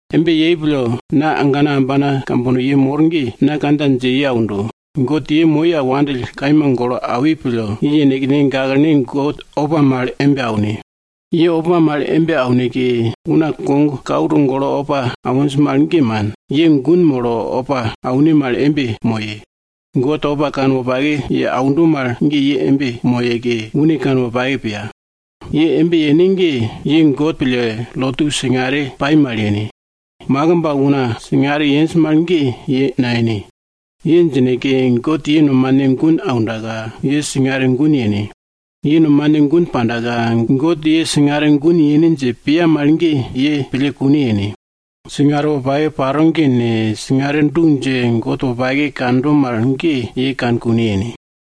Embe yei pille, na agana ambana kambono ye mor ge, na kandja dje ye aundo, God ye moi al wandill kaima golo awi pille, ye yenekne gaklene God opa mal embe aune! Ye opa mal embe auneke, una kogkau togolo opa awinj mal, ge man. Ye gun molo opa aune mal embe moye. God opa kanwopake ye aundo mal ge ye embe moyeke, une kanwopake piya. Ye embe yene ge, ye God pille lotu singare pai mal yene. Makimb al una singare yenj mal ge ye nayene. Ye djineke, God ye nomane gun aundaka, ye singare gun yene. Ye nomane gun pandaka, God ye singare gun yene dje piya mal ge ye pille kune yene. Singare wopake paro ge ne, singare du dje, God wopake kando mal ge ye kane kune yene.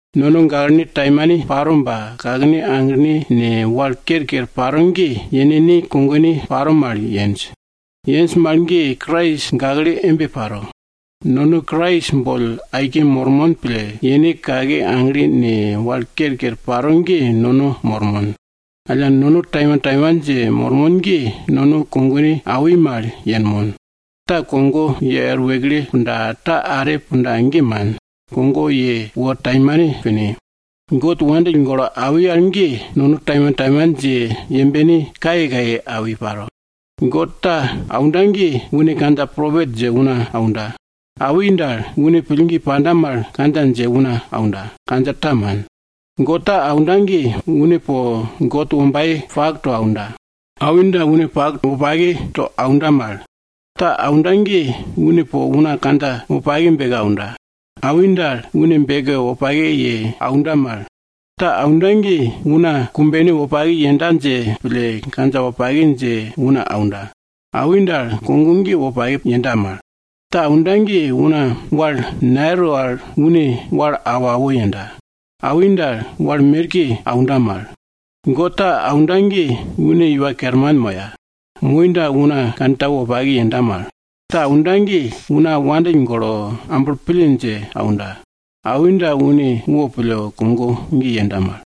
Nono gaklene taimane paro ba, kakene aglene ne, wal kerker paro ge, yenekne kogone paro mal yenj. Yenj mal ge Krais gakle embe paro. Nono Krais boll aike mormon pille, yene kake agle ne, wal kerker paro ge nono mormon. Alla nono taimantaiman dje mormon ge, nono kogone awi mal yenmon. Ta kogo ye er wekle punda ta are punda ge man, kogo ye wor taimane pine. God wopake pille awi al ge, nono taimantaiman dje yembene kayekaye awi paro. God ta aunda ge, une kandja propet dje una aunda. Awi dal, une pillgi panda mal kandja dje una aunda, kandja ta man. God ta aunda ge, une po God wombaye pak to aunda. Awi dal, une pak wopake to aunda mal. Ta aunda ge, une po una kandja wopake beke aunda. Awi dal, une beke wopake ye aunda mal. Ta aunda ge, una kumbene wopake yenda dje pille, kandja wopake dje una aunda. Awi dal, kogo ge wopake yenda mal. Ta aunda ge, una wal nayero al une wal awo awo yenda. Awi dal, wal merke aunda mal. God ta aunda ge, une iwa kerman moya. Moi dal, una kantau wopake yenda mal. Ta aunda ge, una wandill golo, amblo pille dje aunda. Awi dal, une wopille kogo ge yenda mal.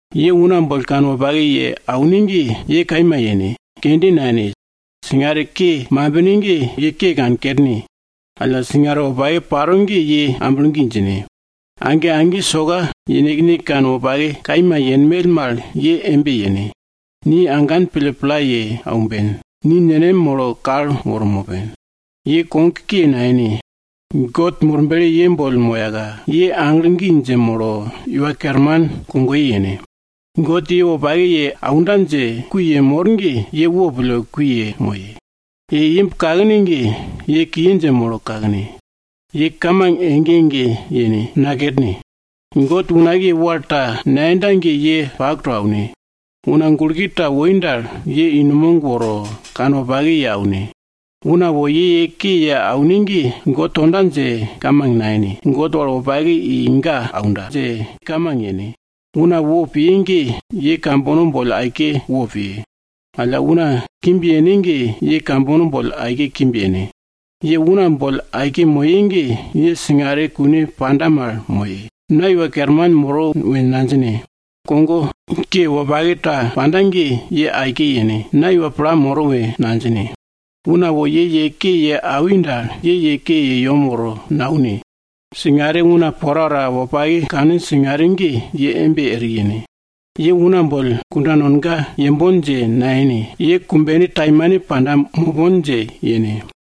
Ye una boll kanwopake ye aune ge, ye kaima yene, kende nayene. Singare ke mambine ge, ye kankerne. Alla, singare wopake paro ge ye amblo gi djine. Age age soka yenekne kanwopake kaima yenmell mal ye embe yene. Ni agan pille pla ye aumben, ni nenem molo kal woro mopen. Ye kogke nayene, God Murble ye boll moyaka, ye aglo gi dje molo Iwa Kerman kogoye yene. God ye wopake ye aunda dje kui yemor ge, ye wopille kui yemoye. Ye imb kakne ge, ye kiye dje molo kakne. Ye kamang ege ege yene, nakerne. God unakiye wal ta nayenda ge, ye pak to aune. Una gulke ta woi dal, ye i numog woro kanwopake ye aune. Una wo ye ke ye aune ge, ye God tonda dje kamang nayene, ye God wal wopake i ga aunda dje kamang yene. Una wopiye ge, ye kambono boll aike wopiye. Alla, una kimb yene ge, ye kambono boll aike kimb yene. Ye una boll aike moye ge, ye singare kune panda mal moye. Na iwa kerman moro we nadjine, kogo ke wopake ta panda ge, ye aike yene! Na iwa pla moro we nadjine! Una wo ye ye ke ye awi dal, ye ye ke ye yem woro naune. Singare una porapora wopake kaninj singare ge, ye embe eri yene. Ye una boll kunda nonga yembon dje nayene, ye kumbene taimane panda mopon dje yene.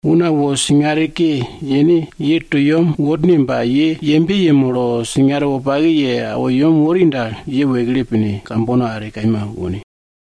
Una wo singare ke yene ye to yem worne ba, ye yembe yemolo singare wopake ye awo yem wori dal, ye wekle pine, kambono are kaima wone.